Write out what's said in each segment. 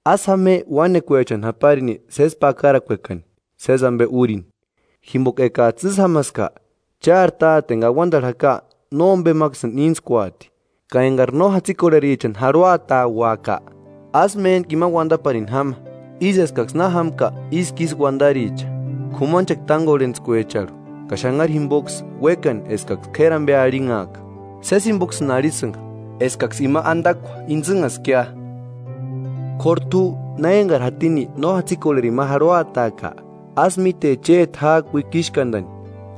“Ásï jáma je uánekuechani japarini sési pakarakuekani, sési ampe úrini, jimpoka ekats'ï ísï jámaska, chári Táte enka auantarhu jaka nómpemaksïni íntskuati.” “Ka enkari no jatsikorherichani jarhuatauaka, ásï méntku imani uantaparini jáma, ísï eskaksï na jámka ísku ísï uantaricha, k'umanchekua tánkorhentskuecharhu ka xanharu jimpoksï uékani eskaksï k'éri ampe arhinhaaka. Sési jimpoksïni arhisïnka, eskaksï ima antakua intsïnhaskia. K'óru t'u na enkari jatini no jatsikorherini ma jarhuataaka, ásï míte chéti ják'i uikixkantani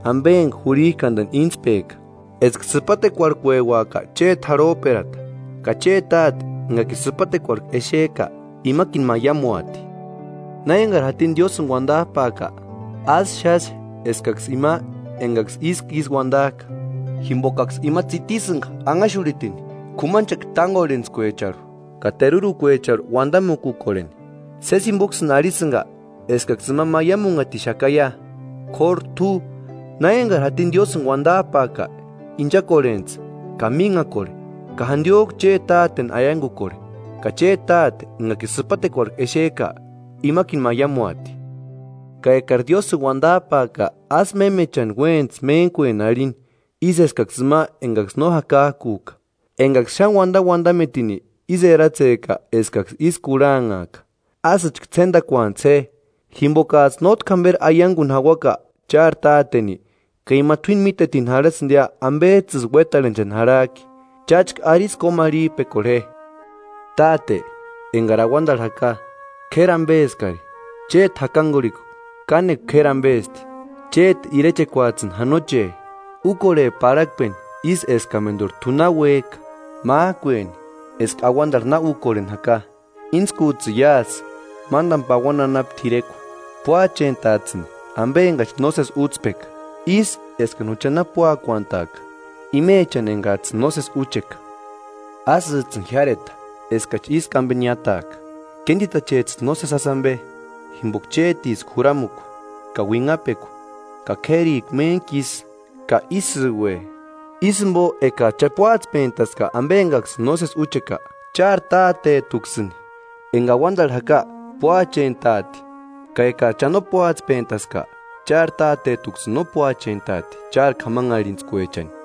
ampe enka jurhik'antani íntspeka, eska sïpatekuarhkueuaka chéti jarhop'erata ka chéti Táte enkakini sïpatekuarhku exek'a, imakini maiamuati.” “Na enkari jatini Diósïni uantap'aaka, ásï xáxe eskaksï ima enkaksï ísku ísï uantak'a, jimpokaksï ima tsitisïnka anhaxurhitini k'umanchekua tánkorhentskuecharhu ka terurukuecharhu uantamukukorheni; sési jimpoksïni arhisïnka eskaksï ima maiamunhatixakaia. K'óru t'u, na enkari jatini Diósïni uantap'aaka, inchakorhentsï ka mínhakorheni ka jantiok'u chéti Táteni aiankukorhe, ka chéti Táte enka sïpatekuarhut'u exek'a, imakini maiamuati.” “Ka ekari Diósïni uantap'aaka ásï mémechani uéntsï méntkueni arhini ísï eskaksï ima enkaksï no jakak'uk'a, enkaksï xáni uantauantametini ísï eratsek'a eskaksï ísï kurhanhaaka. Ásïchka ts'éntakuantsï je, jimpokats'ï nótki jamperi aiankuni jauaka chári Táteni, ka ima t'uíni mítetini jarhasïntiia ampets'ïsï uétarhenchani jarhak'i. Cháchka arisï kómarhip'ekorhe je: ‘Táte, enkari auantarhu jaka, k'éri ampeskari, chéti jakankurhikua kánekua k'éri ampesti. Chéti irechekuats'ïni janoche. Úkorhe parhakpeni ísï eskamenturi t'u na uék'a, mák'ueni eska auantarhu na úkorheni jaka. Íntskuts'ïni iásï, mántani pauani anapu t'irekua. Púachent'ats'ïni ampe enkachi nósesi útspeka, ísï eskani jucha na púakuantak'a imechani enkats'ïni nósesi úcheka. Ásïts'ïni jiáreta eskachi ísku ampe niátaaka, kéntitachets'ïni nósesi jásï ampe. [Jimpoka chétiska Juramukua ka uinhapekua ka k'érikua méntku isï. Ka ísïue.]’” “Ísï jimpo ekats'ï cha púatspentaska ampe enkaksïni nósesi úcheka, chári Tátet'uksïni, enka auantarhu jaka, púachent'aati; ka ekats'ï cha no púatspentaska, chári Tátet'uksïni no púachent'auati chári k'amanharhintskuechani.”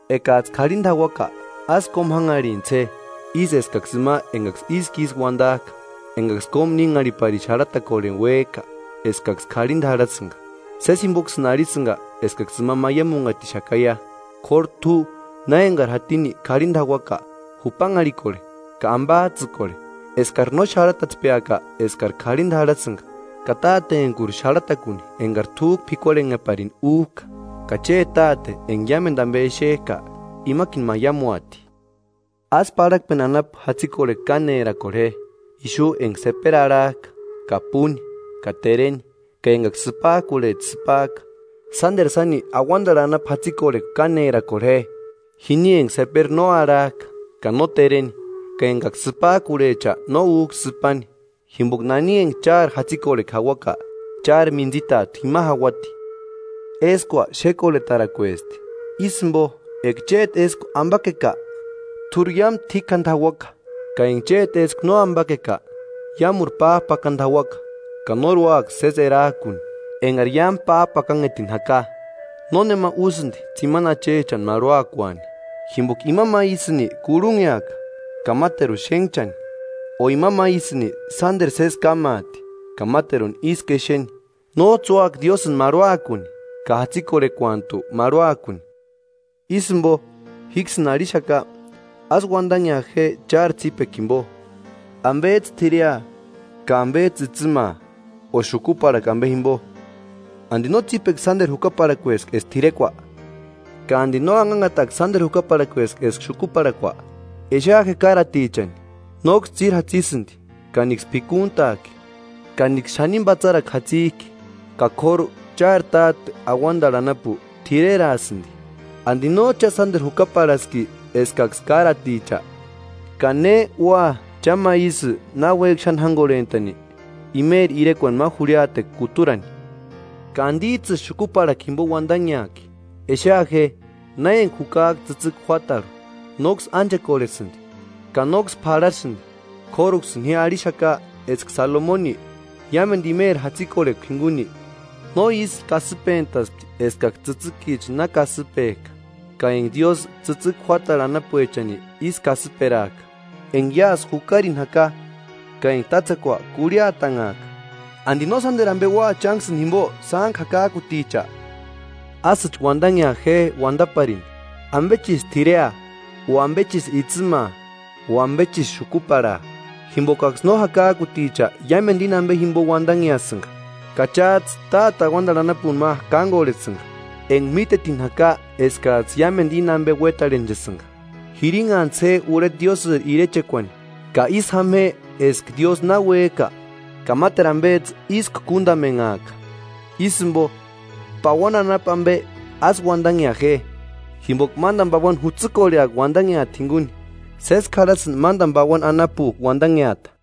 “Ekats'ï k'arhinta jauaka, ásï kómu jánharhintsï je, ísï eskaksï ima enkaksï ísku ísï uantak'a, enkaksï kómu nínharhiparini xarhatakorheni úek'a eskaksï k'arhinta jarhasïnka; sési jimpoksïni arhisïnka eskaksï ima maiamunhatixakaia. K'óru t'u na enkari jatini k'arhinta jauaka, jupanharhikorhe ka ampats'ïkorhe, eskari no xarhatatspeaka eskari karhinta jarhasïnka ka Tátentkuri xarhatakuni enkari t'úk'u p'ikuarhenheparini úk'a, ka chéti Táte enka iámentu ampe exek'a, imakini maiamuati.” “Ásï parhakpeni anapu jatsikorhekua kánerakorhe je, ixu enka seperi arhak'a ka púni ka tereni ka enkaksï sïpak'urhecha sïpak'a. Sánteru sáni auantarhu anapu jatsikorhekua kánerakorhe je, jini enka seperi no arhak'a ka no tereni ka enkaksï sïpak'urhecha no úk'a sïpani. Jimpoka nani enka chári jatsikorhekua jauaka, chári mintsitat'u jima jauati.” “Éskua xékorhetarakuesti; ísï jimpo eka chéti éskua ampakeka, t'úri iámu t'íkjantu jauaka; ka enka chéti éskua no ampakeka, iámuri páp'akantu jauaka, ka nóri úaka sési erak'uni enkari iámu páp'akanhetini jaka.” “Nónema úsïnti tsimani achechani marhuakuani, jimpoka ima ma ísïni kurhunheaka ka máteruni xénhchani, o ima ma ísïni sánteru sési kámaati ka máteruni ísku exeni. Nóts'ï úaka Diósïni marhuakuni ka jatsikorhekuantu marhuakuni.” “Ísï jimpo, jíksïni arhixaka: Ásï uantanhea je chári tsípekua jimpo, ampets'ï t'irea ka ampets'ï itsïmaa o xukuparhakua ampe jimpo ¿Anti no tsípekua sánteru jukaparhakueski eska t'irekua? ¿Ka anti no anhanhatakua sánteru jukaparhakueski eska xukuparhakua? Exea je káratichani, nóksï tsíri jatsisïnti ka níksï p'ikuntak'i ka níksï xanini patsarakua jatsik'i; ka k'óru chári Táte auantarhu anapu t'ireraasïnti. ¿Anti nóts'ï cha sánteru jukaparhaski eskaksï káraticha? ¿Ka ne ua cha ma ísï náuek'i xáni jánkorhent'ani, imeri irekuani ma jurhiatekua kuturani? ¿Ka antits'ïsï xukuparhakua jimpo uantanheak'i? Exea je, na enka jukak'a tsïtsïki juátarhu, nóksï ánchekorhesïnti ka nóksï p'arhasïnti. K'óruksïni ji arhixaka eska Salomoni, iámentu imeri jatsikorhekua jinkuni, no ísï kasïpentaspti eskaksï tsïtsïkicha na kasïpek'a. Ka enka Diósï tsïtsïki juátarhu anapuechani ísï kasïperak'a, enka iásï jukarini jaka ka enka tátsekua kurhiatanhak'a, ¿Anti no sánteru ampe ua chánksïni jimpo, sántku jakak'uticha? Ásïchka uantanhea je uantaparini: ‘¿Ampechisï t'irea o ampechisï itsïmaa o ampechisï xukuparhaa?’ Jimpokaksï no jakak'uticha iámentu íni ampe jimpo uantanheasïnka, ka cháts'ï Táte auantarhu anapuni ma kánkorhesïnka, enka mítetini jaka eskats'ï iámentu íni ampe uétarhenchasïnka. Jirinhantsï je urheta Diósïri irechekuani ka ísï jáma je eska Diósï na uék'a ka máteru ampets'ï ísku kúntamenhaaka. Ísï jimpo, pauani anapu ampe ásï uantanhea je, jimpoka mántani pauani jutsïkorheaka uantanheata jinkuni. Sésku jarhasïnti mántani pauani anapuk'u uantanheata.”